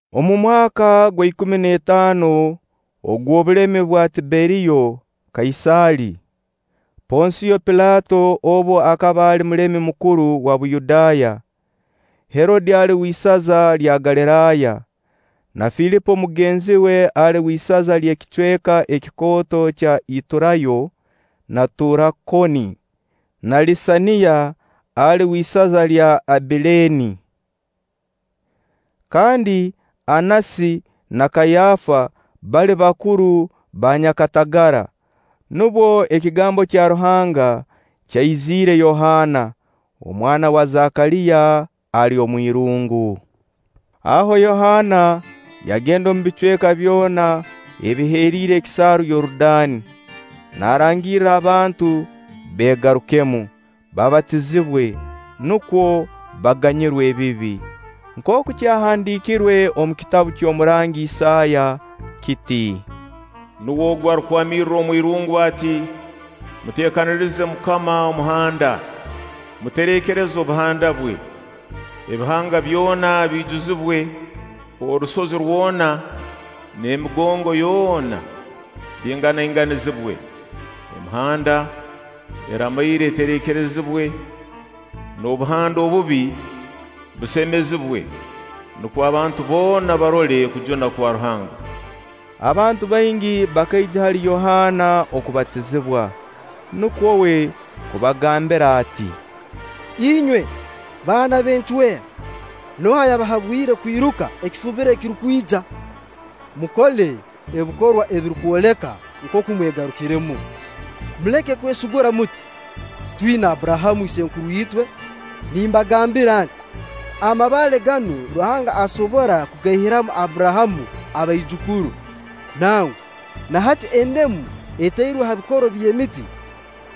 Omu mwaka gwa ikumi n'etaano ogw'obulemi bwa Tiberiyo Kaisaali, Ponsiyo Pilaato obu akaba ali mulemi mukuru wa Buyudaaya, Herode ali w'isaza lya Galiraaya, na Filipo mugenzi we ali w'isaza ly'ekicweka kikooto kya Ituraaya na Turakoni, na Lisaniya ali w'isaza lya Abileene, kandi Annasi na Kaayafa bali bakuru ba banyakatagara, nubwo ekigambo kya Ruhanga kyaiziire Yohaana, omwana wa Zakaliya ali omwirungu. Aho Yohaana yagenda omu bicweka byona ebiheriire ekisaaru Yorudaani, naarangirra abantu beegarukemu, babatizibwe, nukwo baganyirwe ebibi. Nkooku kyahandiirirwe omu kitabu ky'omurangi Isaaya kiti: “Nuwe ogu arukwamirra omwirungu ati: Muteekanirize MUKAMA omuhanda, mutereekereze obuhanda bwe. Ebihanga byona biijuzibwe, orusozi rwona n'emigongo yoona bingangainganizibwe. Emihanda eramaire etereekerezibwe, n'obuhanda obubi busemezibwe; nukwo abantu boona barole okujuna kwa Ruhanga.” Abantu baingi bakaija hali Yohaana okubatizibwa. Nukwo uwe kubagambira ati: “Inywe baana b'encwera! Nooha ayabahabwire kwiruka ekifubiro ekirukwija? Mukole ebikorwa ebirukwoleka nkooku mwegarukiremu. Muleke kwesigura muti: ‘Twina Abburahamu isenkuru itwe.’ Nimbagambira nti: Amabaale ganu Ruhanga asobora kugaihiramu Abburahamu abaijukuru. Nangwa na hati endemu etairwe ha bikoro by'emiti.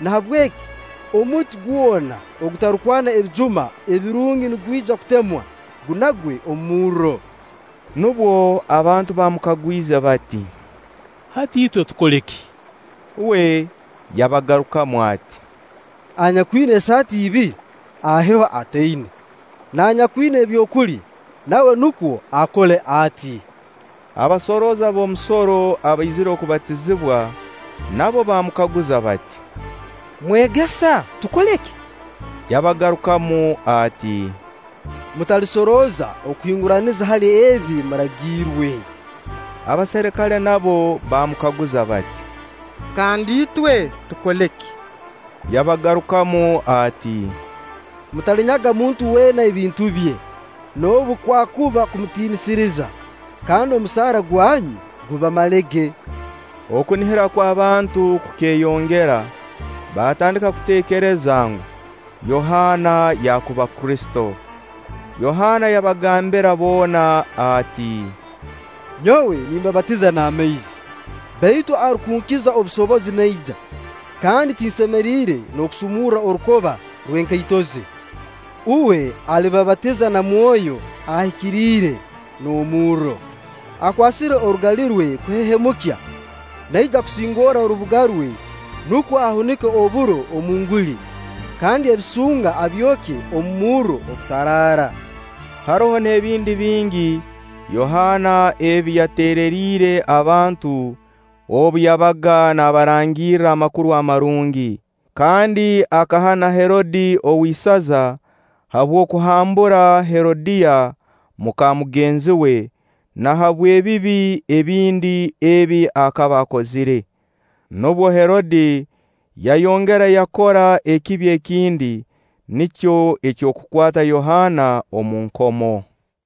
Nahabweki omuti gwona ogutarukwana ebijuma ebirungi nigwija kutemwa, gunagwe omu murro.” Nubwo abantu baamukagwize bati: “Hati itwe tukole ki?” Uwe yabagarukamu ati: “Anyakwina esaati ibiri, aheho ataina; n'anyakwina ebyokulya, nawe nukwo akole ati.” Abasorooza b'omusoro abaizire kubatizibwa nabo baamukaguza bati: “Mwegesa, tukole ki?” Yabagarukamu ati: “Mutalisorooza okuhinguraniza hali ebi muragiirwe.” Abaserikale nabo baamukaguza bati: “Kandi itwe, tukole ki?” Yabagarukamu ati: “Mutalinyaga muntu weena ebintu bye, noobu kwakuba kumutiinisiriza; kandi omusaara gwanyu gubamalege.” Okunihira kw'abantu kukeeyongera, baatandika kuteekereza ngu, Yohaana yaakuba Kristo. Yohaana yagambira boona ati: “Nyowe nimbabatiza n'amaizi; baitu arukunkiza obusobozi naija, kandi tinsemeriire n'okusumurra orukoba rw'enkaito ze. Uwe alibabatiza na Mwoyo Ahikiriire n'omurro. Akwasire orugali rwe kuhehemukya, naija kusingorra orubuga rwe nukwo ahunike oburo omu nguli, kandi ebisunga abyokye omu murro ogutaraara.” Haroho n'ebindi bingi Yohaana ebi yateereriire abantu obu yabaga nabarangirra Amakuru Amarungi. Kandi akahana Herode ow'isaza habw'okuhambura Herodiya muka mugenzi we, na habw'ebibi ebindi ebi akaba akozire. Nubwo Herode yayongera yakora ekibi ekindi, nikyo eky'okukwata Yohaana omu nkomo.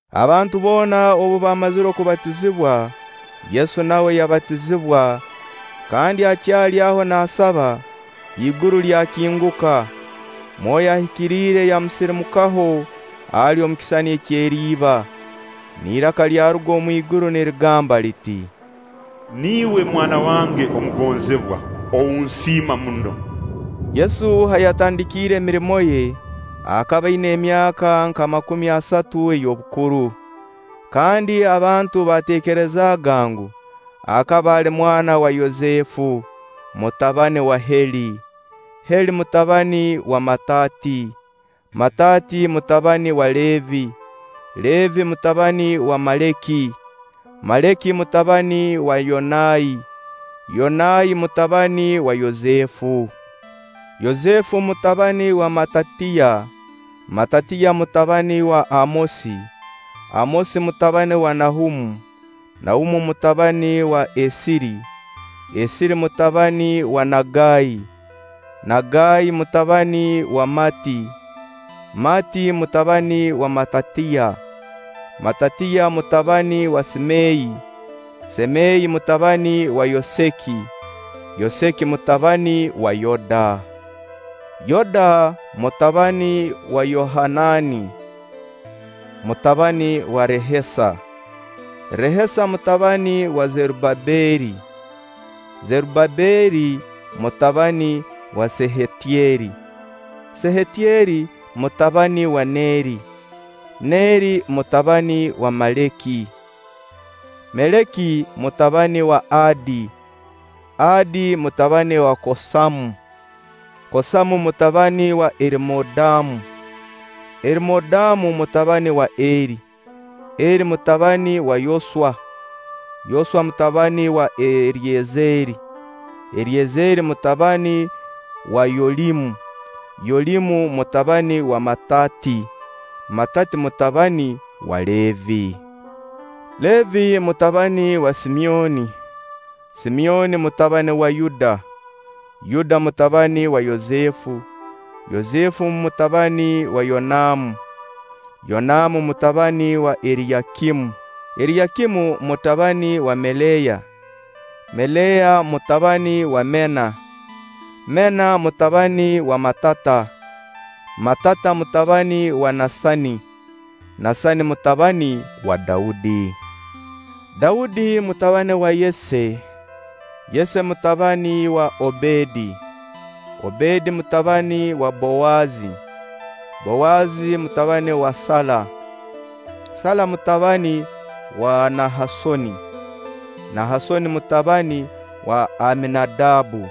Abantu boona obu baamazire kubatizibwa, Yesu nawe yabatizibwa kandi akyali aho naasaba, iguru lyakinguka, Mwoyo Ahikiriire yamusirimukaho ali omu kisisani ky'eriba, n'iraka lyaruga omu iguru nirigamba liti. “Niiwe mwana wange omugonzibwa, ou nsiima muno.” Yesu ha yatandikire emirimo ye, akaba aina emyaka nka makumi asatu ey'obukuru. Kandi abantu baateekerezaaga ngu: akaba ali mwana wa Yosefu, mutabani wa Heeli, Heeli mutabani wa Mataati, Mataati mutabani wa Leevi, Leevi mutabani wa Meleki, Meleki mutabani wa Yanai, Yanai mutabani wa Yosefu, Yosefu mutabani wa Matatiya, Matatiya mutabani wa Amosi, Amosi mutabani wa Nahumu, Nahumu mutabani wa Esiri, Esiri mutabani wa Nagai, Nagai mutabani wa Maati, Maati mutabani wa Matatiya, Matatiya mutabani wa Semeyi, Semeyi mutabani wa Yoseki, Yoseki mutabani wa Yooda, Yooda mutabani wa Yohanani mutabani wa Rehesa, Rehesa mutabani wa Zerubabeeri, Zerubabeeri mutabani wa Seyahtyeri, Seyahtyeri mutabani wa Neeri, Neeri mutabani wa Meleki, Meleki mutabani wa Adi, Adi mutabani wa Kosamu, Kosamu mutabani wa Erimoodamu, Erimoodamu mutabani wa Eri, Eri mutabani wa Yoswa, Yoswa mutabani wa Eryezeeri, Eryezeeri mutabani wa Yolimu, Yolimu mutabani wa Mataati, Mataati mutabani wa Leevi, Leevi mutabani wa Simyoni, Simyoni mutabani wa Yuda, Yuda mutabani wa Yosefu, Yosefu mutabani wa Yonamu, Yonamu mutabani wa Eriyakimu, Eriyakimu mutabani wa Melea, Melea mutabani wa Mena, Mena mutabani wa Matata, Matata mutabani wa Nasani, Nasani mutabani wa Daudi, Daudi mutabani wa Yese, Yese mutabani wa Obedi, Obedi mutabani wa Bowazi, Bowazi mutabani wa Sala, Sala mutabani wa Nahasooni, Nahasooni mutabani wa Aminadabbu,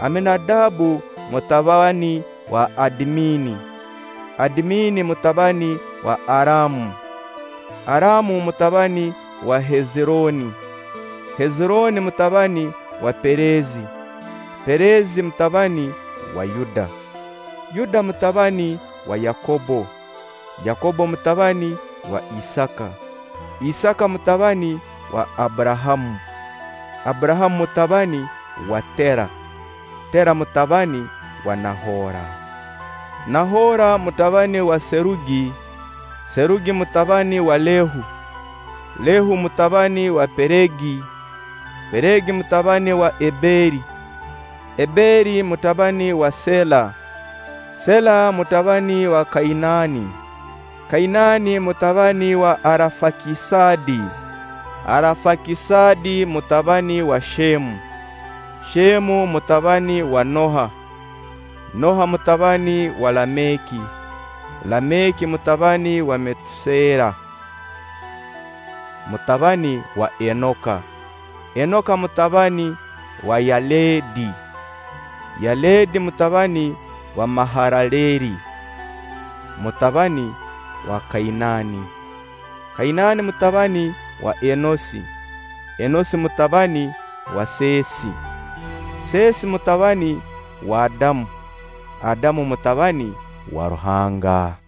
Aminadabbu mutabani wa Adimini, Adimini mutabani wa Aram, Aram mutabani wa Hezirooni, Hezirooni mutabani wa Perezi, Perezi mutabani wa Yuda, Yuda mutabani wa Yakobbo, Yakobbo mutabani wa Isaaka, Isaaka mutabani wa Abburahamu, Abburahamu mutabani wa Teera, Teera mutabani wa Nahora, Nahora mutabani wa Serugi, Serugi mutabani wa Lehu, Lehu mutabani wa Peregi, Peregi mutabani wa Eberi, Eberi mutabani wa Seela, Seela mutabani wa Kainaani, Kainaani mutabani wa Arafakisadi, Arafakisadi mutabani wa Sheemu, Sheemu mutabani wa Noha, Noha mutabani wa Lameki, Lameki mutabani wa Metuseera mutabani wa Enoka, Enoka mutabani wa Yaledi, Yaledi mutabani wa Maharaleeli mutabani wa Kainani, Kainani mutabani wa Enosi, Enosi mutabani wa Seesi, Seesi mutabani wa Adamu, Adamu mutabani wa Ruhanga.